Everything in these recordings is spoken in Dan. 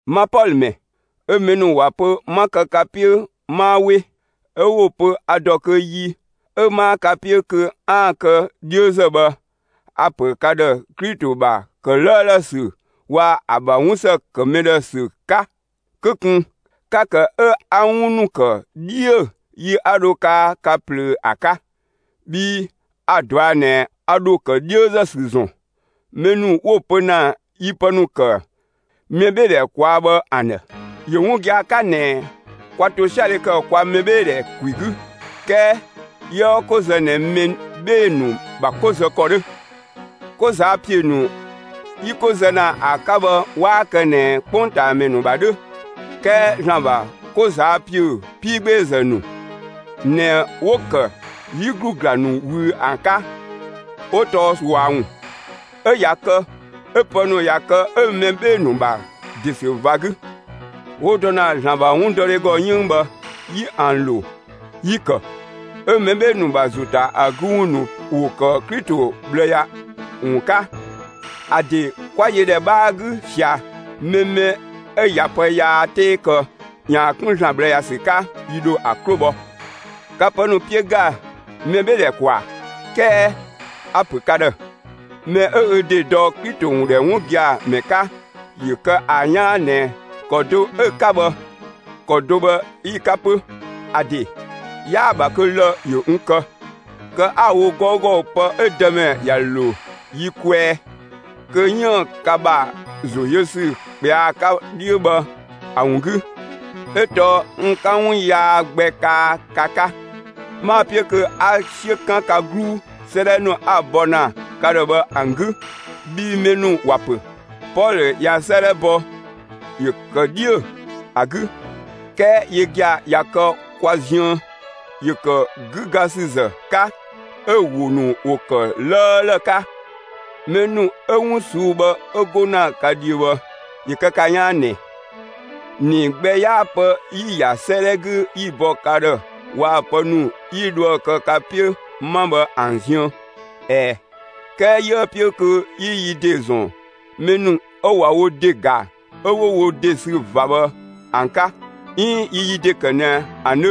Ma Pɔlö ‑mɛ, 'ö mɛ ‑nu ‑wa pö 'ma kë ka 'piö 'maa 'we, 'ö 'wo‑ pö a ‑dɔ kö yi 'ö 'maa ka 'piö kö 'aan‑ kë 'dhiözë bhë, a‑ ‑pö ka ‑dhë Klito ‑bha ‑kë 'lëëlë ‑sü waa‑ ‑a ‑bha 'wun ‑së ‑kë mɛ ‑dhë ‑sü 'ka: Kö ꞊kun 'ka‑ ‑kë 'ö 'a 'wun ‑nu ‑kë 'dhiö yi 'a dho kaa ka ꞊plöö ‑a 'ka. Bhii a‑ ꞊dɔa' ꞊nɛ a ‑dho ‑kë 'dhiözë ‑sü ‑zɔn mɛ ‑nu 'wo‑ pö ‑na yi pë ‑nu ‑kë mɛbheedhɛ ꞊kwaa' bhë ‑an ‑dhë. ‑Yö 'wun gia‑ 'ka ꞊nɛ kwa ‑tosiadhe ‑kë kwa mɛbheedhɛ ‑kwi 'gü; 'kɛɛ 'yiëë 'ko zë ꞊nɛ mɛ 'bhee‑ ‑nu ‑bha 'ko zë ‑kɔ 'dhö. 'Ko ꞊zaa' ‑piö ‑nu 'yi 'ko zë ‑na ‑a 'ka bhë 'waa kë ꞊nɛ 'kpongtaamɛ ‑nu ‑bha 'dhö; 'kɛɛ ‑Zlan ‑bha 'ko ꞊zaa' ‑piö 'piigbeezë ‑nu ꞊nɛ 'wo‑ ‑kë 'yi ‑glu ‑gla ‑nu ꞊wüü ‑an 'ka; 'wo tɔɔ ꞊sua ‑wun. 'Ö ꞊ya kë 'ö pë ‑nu ꞊ya kë 'ö mɛ 'bhee‑ ‑nu ‑bha ‑de ‑sü ꞊va 'gü, 'wo dɔ ‑na ‑Zlan ‑bha 'wundɔdhe ‑gɔ, 'yënng bhë yi ‑an ‑lo. Yi‑ ‑kë 'ö mɛ 'bhee‑ ‑nu ‑bha ‑zo ‑ta ‑a 'gü ‑wun ‑nu ‑wo ‑kë Klito ꞊bhlë ‑ya ‑wun 'ka. ‑A ‑de 'kwa yö ‑dhɛ 'bhaa 'gü ꞊sia mɛ mɛ 'ö ꞊ya pë yaa 'tee kë ‑yaan 'kun ‑Zlan ꞊bhlë ‑ya ‑sü 'ka, yi ‑dho ‑a 'klo bhɔ. Ka pë ‑nu 'piö ‑ga mɛbheedhɛ ‑kwaa. 'Kɛɛ a‑ ‑pö ka ‑dhë, mɛ 'ö ö ‑de dɔ Klito ‑wun ‑dhɛ 'wun gia‑ ‑mɛ 'ka, ‑yö kë ‑a 'yaan ꞊nɛ ‑kɔ do 'ö‑ 'ka bhë, ‑kɔ do bhë 'yi‑ 'ka 'pö. ‑A ‑de 'yaa‑ ‑bha kö lë‑ ‑yö n kë, kë 'a‑ wo 'gɔugɔ pë 'ö Dëmɛ ‑ya ‑lo yi kwɛɛ, kö 'yiën‑ ka ‑bha ‑zo yö ‑sü ꞊kpɛa'‑ 'ka 'dhiö bhë ‑a ‑wun 'gü, 'ö tɔɔ n 'ka 'wun yaa gbɛ kaa ka 'ka. 'Maa‑ 'piö kö 'a 'siö 'kan ka 'gluu 'sëëdhɛ ‑nu 'a‑ bɔ ‑na ka ‑dhë bhë ‑an 'gü. Bhii mɛ ‑nu ‑wa ‑pö: «Pɔlö ꞊ya 'sëëdhɛ bɔ, ‑yö kë 'dhiö‑ ‑a 'gü, 'kɛɛ yö gia‑ ꞊ya kë kwa ziën, ‑yö ‑kë 'gügasüzë 'ka 'ö‑ ‑wo ‑nu ‑wo ‑kë 'lëëlë 'ka.» Mɛ ‑nu 'ö 'wun ꞊suu'‑ bhë 'ö 'go ‑na ka dhiö bhë ‑yö kë ka 'yaan ꞊nɛ: ‑Nii gbɛ 'yaa pë 'yi‑ ‑ya 'sëëdhɛ 'gü 'yi‑ bɔ ka ‑dhë waa‑ pë ‑nu 'yi dhoë‑ kë ka 'piö 'ma bhë ‑an ziën. ꞊Ɛɛ, 'kɛɛ 'yiëë‑ 'piö kö 'yi yi ‑de ‑zɔn mɛ ‑nu 'ö ꞊wa wo ‑de ‑ga 'ö 'wo wo ‑de sü ꞊va bhë ‑an 'ka 'iin 'yi yi ‑de kë ꞊nɛ ‑an 'dhö;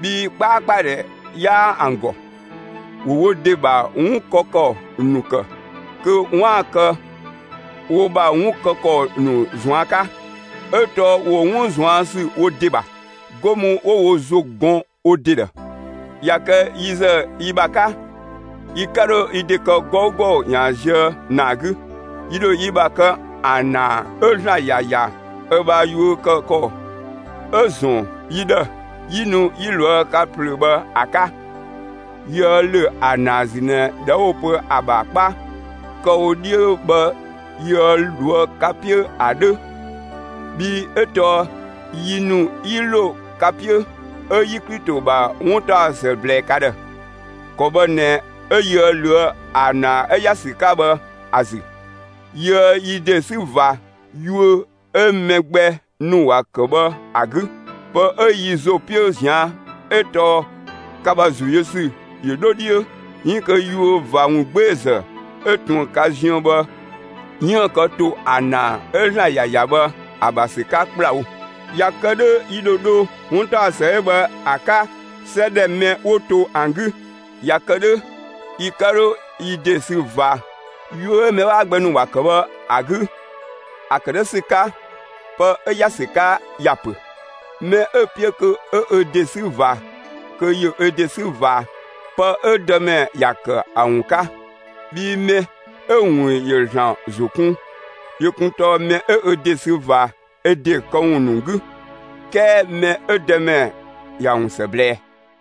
bhii 'kpaakpadhɛ 'yaa ‑an ‑gɔ. ‑Wo wo ‑de ‑bha 'wun kë ‑kɔ ‑nu ‑kë, kö 'waan‑ ‑kë wo ‑bha 'wun kë ‑kɔ ‑nu ꞊zuan' 'ka, 'ö tɔɔ ‑wo 'wun ꞊zuan' ‑sü wo ‑de ‑bha, 'go mü 'wo wo ‑zo gɔn wo ‑de ‑dhë. ꞊Ya kë yi ‑zë yi ‑bha 'ka, yi 'ka 'dho yi ‑de kë 'gɔugɔ ‑yaan zië ‑naa 'gü. Yi ‑dho yi ‑bha kë ‑a ‑naa 'ö ‑Zlan ‑ya ‑ya ö ‑bha yuö kë ‑kɔ 'ö‑ ‑zɔn yi ‑dhë 'yi nu 'yi ꞊loë' ka ꞊plöö bhë ‑a 'ka. Yiëë ‑lö ‑a ‑naa ‑zü ꞊nɛ ꞊dhɛ 'wo‑ pö ‑a ‑bha 'kpa kë‑ wo 'dhiö bhë yiëë ꞊loë' ka 'piö ‑a 'dhö. Bhii 'ö tɔɔ yi ‑nu 'yi ‑lo ka 'piö, 'ö 'yi Klito ‑bha 'wuntaɔsë ꞊blɛɛ ka ‑dhë. ‑Kɔ bhë ꞊nɛ 'ö 'yiëë ꞊löë' ‑a ‑naa 'ö ‑ya ‑sü 'ka bhë ‑a ‑zü; yiëë yi ‑de 'sü ꞊va yuö 'ö mɛ gbɛ ‑nu ‑wa ‑kë bhë ‑a 'gü. Pë 'ö yi ‑zo 'piö ꞊zian' 'ö tɔɔ ka ‑bha ‑zo yö ‑sü ‑yö 'dho 'dhiö, 'iin kö yuö ꞊va ‑wungbeezë 'ö ꞊tun ka ziën bhë 'yiën‑ kë ‑to ‑a ‑naa 'ö ‑Zlan ‑ya ‑ya bhë ‑a ‑bha ‑sü 'ka ‑kplawo. ꞊Ya kë 'dhö 'yi ‑dho dho 'wuntaɔsë 'ö bhë ‑a 'ka 'sɛ ‑dhɛ mɛ 'wo to ‑an 'gü; ꞊ya kë 'dhö, yi 'ka 'dho yi ‑de sü ꞊va yuö 'ö mɛ 'waa gbɛ ‑nu ‑wa ‑kë bhë ‑a 'gü. ‑A ‑kë 'dhö ‑sü 'ka, pë 'ö ‑ya ‑sü 'ka ‑ya ‑pö: «Mɛ 'ö‑ 'piö kö 'ö ö ‑de 'sü ꞊va, kö ‑yö ö ‑de 'sü ꞊va pë 'ö Dëmɛ ‑ya ‑kë ‑a ‑wun 'ka.» Bhii mɛ 'ö‑ ‑wun ‑yö ‑Zlan ‑zo kun yö kun tɔɔ mɛ 'ö ö ‑de sü ꞊va ö ‑de këwun ‑nu 'gü 'kɛɛ mɛ 'ö Dëmɛ ‑ya ‑wun ‑së ꞊blɛɛ.